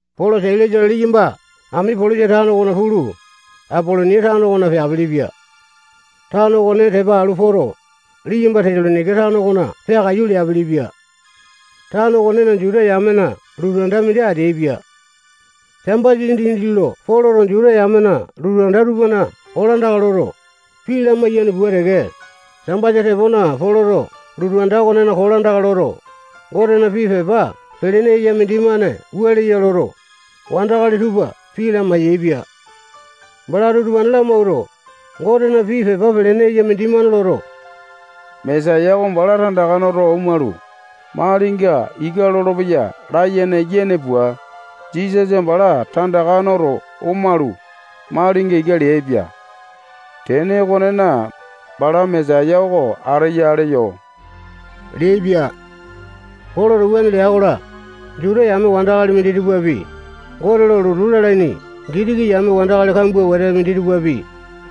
Polo, Sailasa-la, liyamba Amipolisa tano okona pulu, Apolonia tano okona peapilipia. Tano okone tepa alu poto, liyamba Tesalonaika tano okona peakaiyu leapilipia. Tano okonena Juta yamena lotu anda mindi ateaipia. Sambasa dindi lo Poloto Juta yamena lotu anda tupana kolandaka loto, pii lamiayane pua teke, Sambasa tepona Poloto lotu anda okonena kolandaka loto, Gotena pii pepa pelene eya mindimane wua leya loto, wandakali tupa pii lamai-yaepia. Balato utupane lamawuato, Gotena pii pepa pelene eya mindimane loto, Mesaya oko bala tandaka noto omalu, malinga ika lolopeya layene yene pua, Jisasa bala tandaka noto omalu, malinga ika leaipia. Tene okonena, bala Mesaya oko ateya leyo leaipia. Poloto wuane lea-kola, Juta yame wandakali minditupapi, Gote lo lotu lalaini Gitiki yame wandakali kambua wete minditupapi,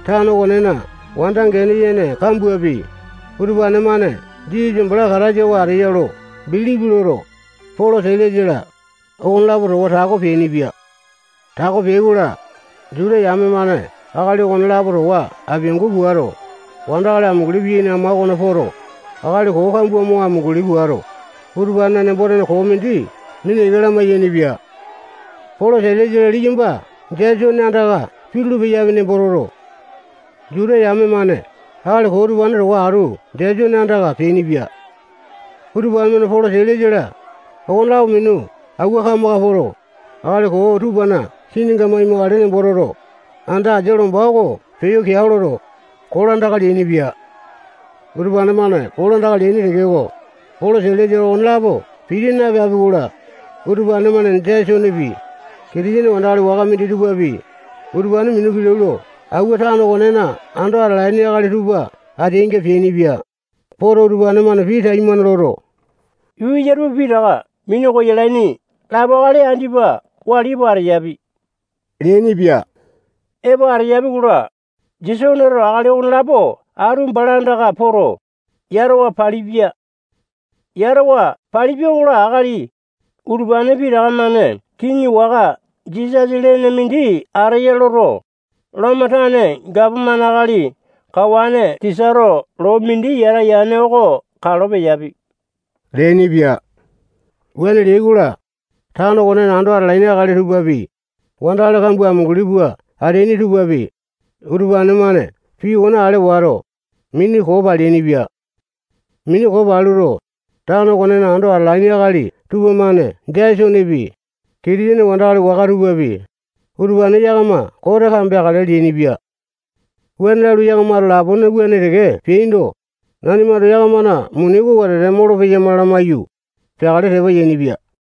tano okonena wanda gene yene kambuapi, utupane-mane Jisasa bala Kataisa oko ateya lo bilipi loto, Polo, Sailasa-la, okonelapo towa tako peainipia. Tako peai-kola, Juta yame-mane akali okonelapo towa apiangu puato, wandakali amunguli piyaini ama okona poto, akali koo kambua mo amunguli puato, utupanena nembo-tene koo mindi mina ika lamai-yainipia. Polo, Sailasa-la, liyamba Jesone andaka pitulu-peyapi nembo toto, Juta yame-mane akali koo utupane towa atu Jesone andaka peainipia. Utupane-mane Polo, Sailasa-la, okonelapo minu awua kamaka poto, akali koo tupana kininga maimakale nembo toto, anda asia lomba oko peyo keao loto, kolandaka leainipia. Utupane-mane kolandaka leaini tekeko, Polo, Sailasa-la, okonelapo piti napeapi-kola, utupane-mane Jesonepi, Kitisene wandakali waka minditupapi, utupane minu kilau lo awua tano okonena ando atalaini akali tupa ateainga peainipia. Poto, utupane-mane pii taimane loto, yuu eya tupa pitaka minu koyalaini lapo akali andipa wali epo ateyapi leainipia. Epo ateyapi-kola, Jesoneto akali okonelapo atu bala andaka poto, yatawa palipia. Yatawa palipia-kola, akali utupane pitaka-mane kiŋi waka Jisasa lene mindi ateya loto, Lomo tane gapomane akali kawane Sisato loo mindi yata yane oko kalo peyapi leainipia. Wuane leai-kola, tano okonena ando atalaini akali tupapi, wandakali kambua amunguli pua ateaini tupapi, utupane-mane pii okone ale wato, mini koo paleainipia. Mini koo paluto, tano okonena ando atalaini akali tupamane Jesonepi, Kitisene wandakali waka tupapi, utupane yakama kote kambeakale leainipia. Wuane lalu, yakamato lapone wuane teke peaindo, nanimato yakamana muni oko wetete molopeyama lamaiyu, peakale tepa yainipia.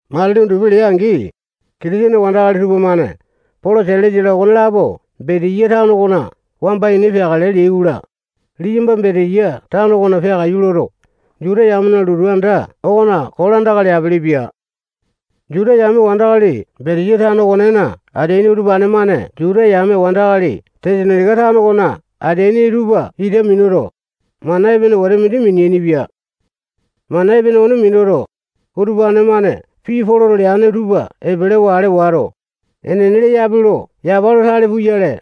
Matili undupi lea-angi, Kitisene wandakali tupamane Polo, Sailasa-la, okonelapo Betiya tano okona wamba ini peakale leai-kola, liyamba Betiya tano okona peakaiyu loto, Juta yamena lotu anda okona kolandaka leapilipia. Juta yame wandakali Betiya tano okonena ateaini utupane-mane Juta yame wandakali Tesalonaika tano okona ateaini tupa ita minuto, mana epene wete mindi mineaini-pia. Mana epene okone minuto, utupane-mane pii Poloto leane tupa epelewa ale wato, enene leyape lo yapa lo tale puyale,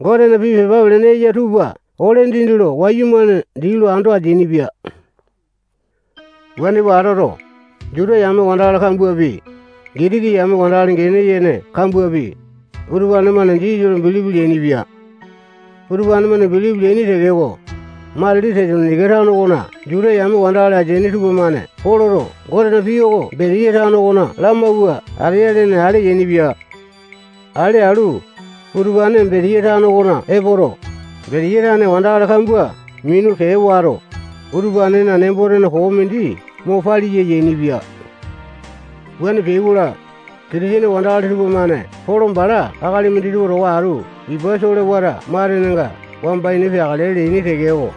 Gotena pii pepa pelene eya tupa ole dindi lo wayumane dii lo ando ateainipia. Wuane pua atoto, Juta yame wandakali kambuapi, Gitiki yame wandakali gene yene kambuapi, utupane-mane Jisasa lo bilipi leainipia. Utupane-mane bilipi leaini tekeko, matili Tesalonaika tano okona Juta yame wandakali ateaini tupamane Poloto Gotena pii oko Betiya tano okona lamawua ateya lene ale yainipia. Ale alu, utupane Betiya tano okona epoto, Betiya tane wandakali kambua minu kee wato, utupanena nembo-tene koo mindi mo paliya yainipia. Wuane peai-kola, Kitisene wandakali tupamane Polo bala akali minditupa towa atu ipa solewata matenenga wamba ini peakale leaini tekeko,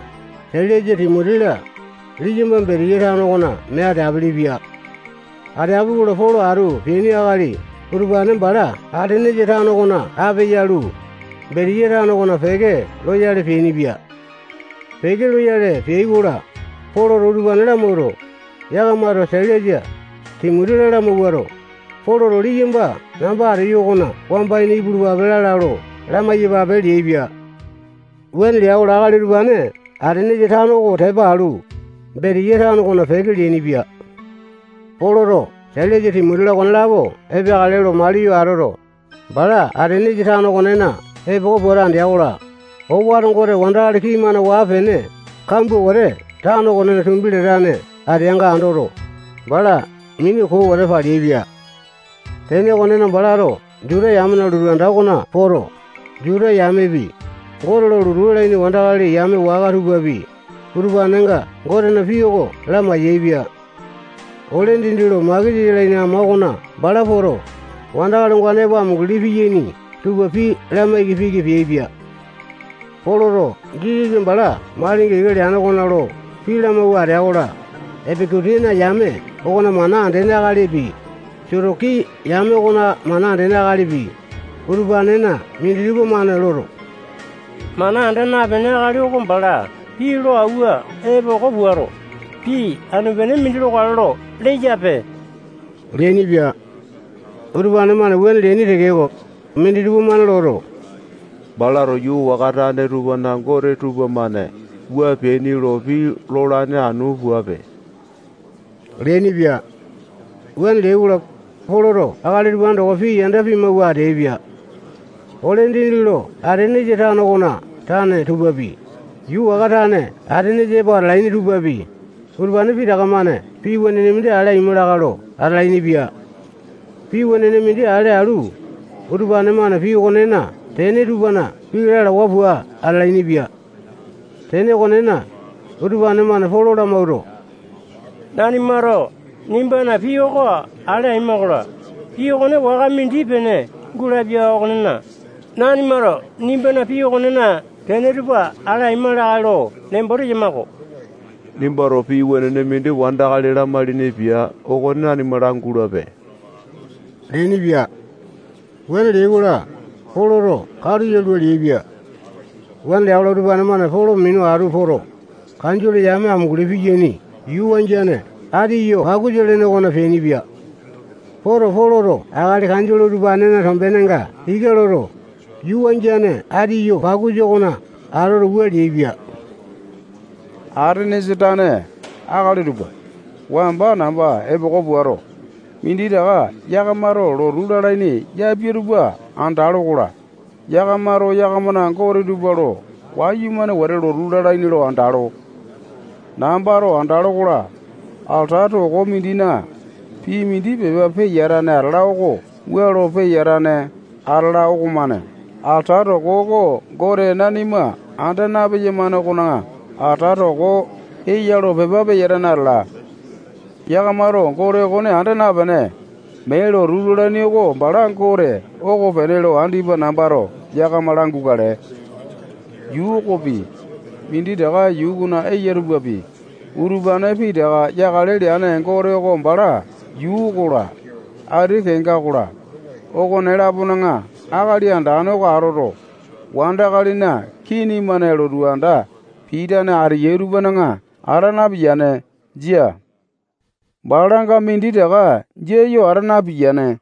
Sailasa, Timoti-la, liyamba Betiya tano okona mee ateapele-pia. Ateapi-kola, Polo atu peaini akali utupane bala Atenesa tano okona ape yalu, Betiya tano okona peke loyale peainipia. Peke loyale peai-kola, Poloto utupane lamawuato, yakamato Sailasa, Timoti-la, lamawuato, Poloto liyamba namba ateyo okona wamba ini ipulupape lala lo lamai-yapape leaipia. Wuane lea-kola, akali utupane Atenesa tano oko tepa alu, Betiya tano okona peke leainipia. Poloto Sailasa, Timoti-la, okonelapo epeakale lo maliyo atoto, bala Atenesa tano okonena epoko puato andea-kola, owato gote wandakali kii-mane waa-pene kambua wete tano okonena tumbi latane ateanga andoto, bala mini koo wete paleaipia. Tene okonena, balato Juta yamena lotu anda okona poto, Juta yamepi, Gote lo lotu lalaini wandakali yame waka tupapi, utupanenga Gotena pii oko lamai-yaepia. Ole dindi lo makesa yalaini ama okona bala poto, wandakali ongane epo amunguli piyaini tupa pii lamaiki piki peaipia. Poloto Jisasa bala malinga ika leane okona lo pii lamawua atea-kola, Epeku-tiana yame okona mana andene akalipi, Sotoki yame okona mana andene akalipi, utupanena minditupa-mane loto, mana anda napene akali oko bala pii lo awua epoko puato, pii anu-pene mindi lokale lo leyape leainipia. Utupane-mane wuane leaini tekeko, minditupa-mane loto, balato yuu waka tane tupana Gote tupamane wua peaini lo pii lolane anu puape leainipia. Wuane leai-kola, Poloto akali utupane towa pii yanda pimawua ateaipia. Ole dindi lo Atenesa tano okona tane tupapi, yuu waka tane Atenesa epo atalaini tupapi, utupane pitaka-mane pii wenene mindi ale aima lakae lo atalainipia. Pii wenene mindi ale alu, utupane-mane pii okonena tene tupana pii lalawa pua atalainipia. Tene okonena, utupane-mane Polo lamawuato, nanimato nimbana pii oko ale aima-kola, pii okone waka mindi-pene gulapia okonena, nanimato nimbana pii okonena tene tupa ale aima lakae lo nembo teyama-ko. Nimbato pii wenene mindi wandakali lamailini pia okone nanima langulape leainipia. Wuane leai-kola, Polo katu yalua leaipia. Wuane lea-kola, utupane-mane Polo minu atu poto, kanjole yame amunguli piyaini yuu wangiane Atiyo-pakusa lene okona peainipia. Poto, Poloto akali kanjole utupanena tombenenga ika loto, yuu wangiane Atiyo-pakusa okona atoto, wua leaipia: Atenesa tane akali tupa, wamba namba epoko puato, minditaka yakamato lotu lalaini yapia tupa andalo-kola, yakamato yakamana gote tupa lo wayumane wete lotu lalaini lo andalo. Nambato andalo-kola, alata toko mindina pii mindi pepa peyatane atala oko wua lo peyatane atala okomane alata toko oko gote nanima anda napeyamane okona alata toko eya lo pepa peyatane atala. Yakamato Gote okone anda napene, mee lotu lalaini oko bala Gote okopene lo andipa nambato yakama langukale. Yuu okopi, minditaka yuu okona eya tupapi, utupane pitaka yakale leane Gote oko bala yuu okola, ati kenga okola, okone-lapona akali andane oko atoto, wandakalina kini-mane lotu anda pitane ateyai tupana ata napiyane. Jia. Balanga minditaka jia yo ata napiyane.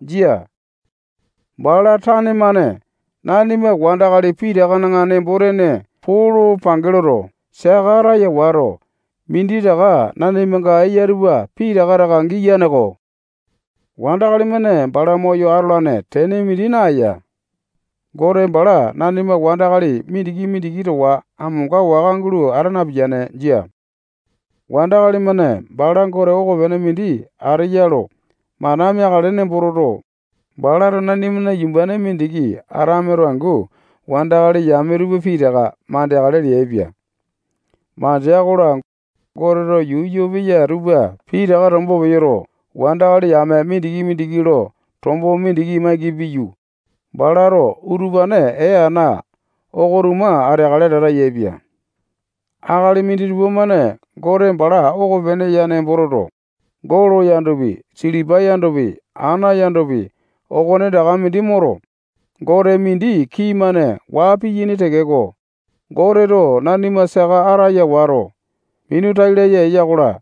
Jia. Bala tane-mane nanima wandakali pitakana nembo-tene poo lo pange loto, saka ataya wato, minditaka nanimanga eya tupa pitaka taka giyane-ko. Wandakali-mane bala moyo atolane tene mindi naeya. Gote bala nanima wandakali mindiki-mindiki towa amonga waka gulo ata napiyane. Jia. Wandakali-mane bala gote okopene mindi ateya lo mana meakale nembo toto, balato nanimana yumbane mindiki Atameto angu wandakali yame tupa pitaka mandeakale leaipia. Mandea-kola, Goteto yuu yoo peya tupa pitaka tombo peyoto, wandakali yame mindiki-mindiki lo tombo mindi maiki piyu, balato utupane ee ana oko-tuma ateakale lata yaepia. Akali minditupa-mane Gote bala okopene ya nembo toto, golo yandopi, silipa yandopi, ana yandopi, okonetaka mindi moto, gote mindi kii-mane waa piyaini tekeko, Goteto nanima saka ataya wato, minu tai laya eya-kola,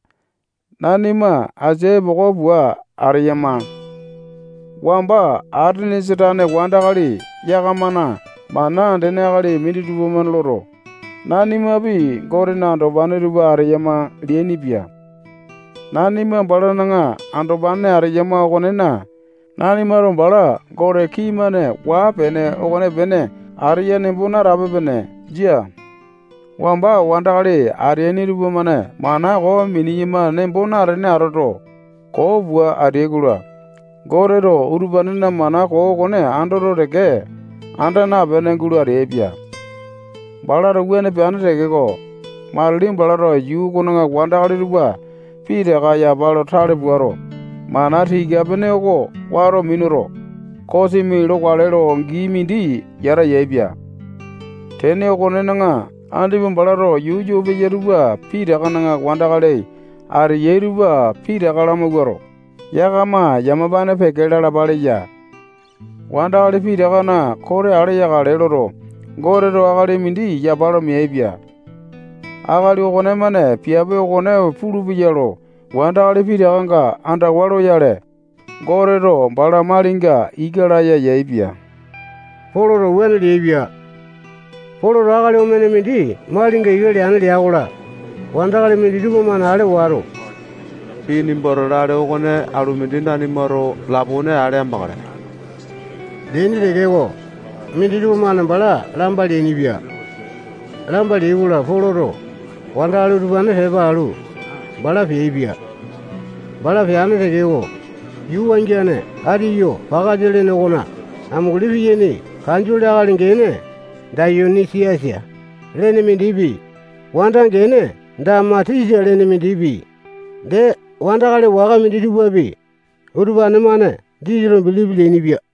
nanima asia epoko pua ateyama. Wamba Atenesa tane wandakali yakamana mana andene akali minditupa-mane loto, nanimapi Gotena andopane tupa ateyama leainipia. Nanima balana andopane ateyama okonena, nanimato bala gote kii-mane waa-pene okonepene ateya nembo natape-pene. Jia. Wamba wandakali ateaini tupamane mana koo mineyama nembo natene atoto, koo pua ateai-kola, Goteto utupanena mana koo okone andoto teke, anda napene gulo ateaipia. Balato wuane peane tekeko, matili balato yuu okona wandakali tupa pitaka yapa lo tale puato, mana tika-pene oko wato minuto, kosimi lokale lo gii mindi yata yaepia. Tene okonena, andipa balato yuu yoo peya tupa pitakana wandakali ateyai tupa pitaka lamawuato, yakama yamapane peke lalapa leya. Wandakali pitakana kote ale yakale loto, Goteto akali mindi yapa lo meaipia. Akali okonemane piape okone pulupeya lo wandakali pitakanga andawa loyale, Goteto bala malinga ika laya yaepia. Poloto wuane leaipia. Poloto akali omene mindi malinga ika leane lea-kola, wandakali minditupa-mane ale wato, Pii nimbato lale okone alu mindi nanimato lapone ale amakale, leaini tekeko, minditupa-mane bala lamba leainipia. Lamba leai-kola, Poloto wandakali utupane tepa alu, bala peaipia. Bala peane tekeko, yuu wangiane Atiyo-pakasa lene okona amunguli piyaini kanjole akali gene Dayoni-siasa lene mindipi, wanda gene Damatisa lene mindipi, dee wandakali waka minditupapi, utupane-mane Jisasa lo bilipi leainipia.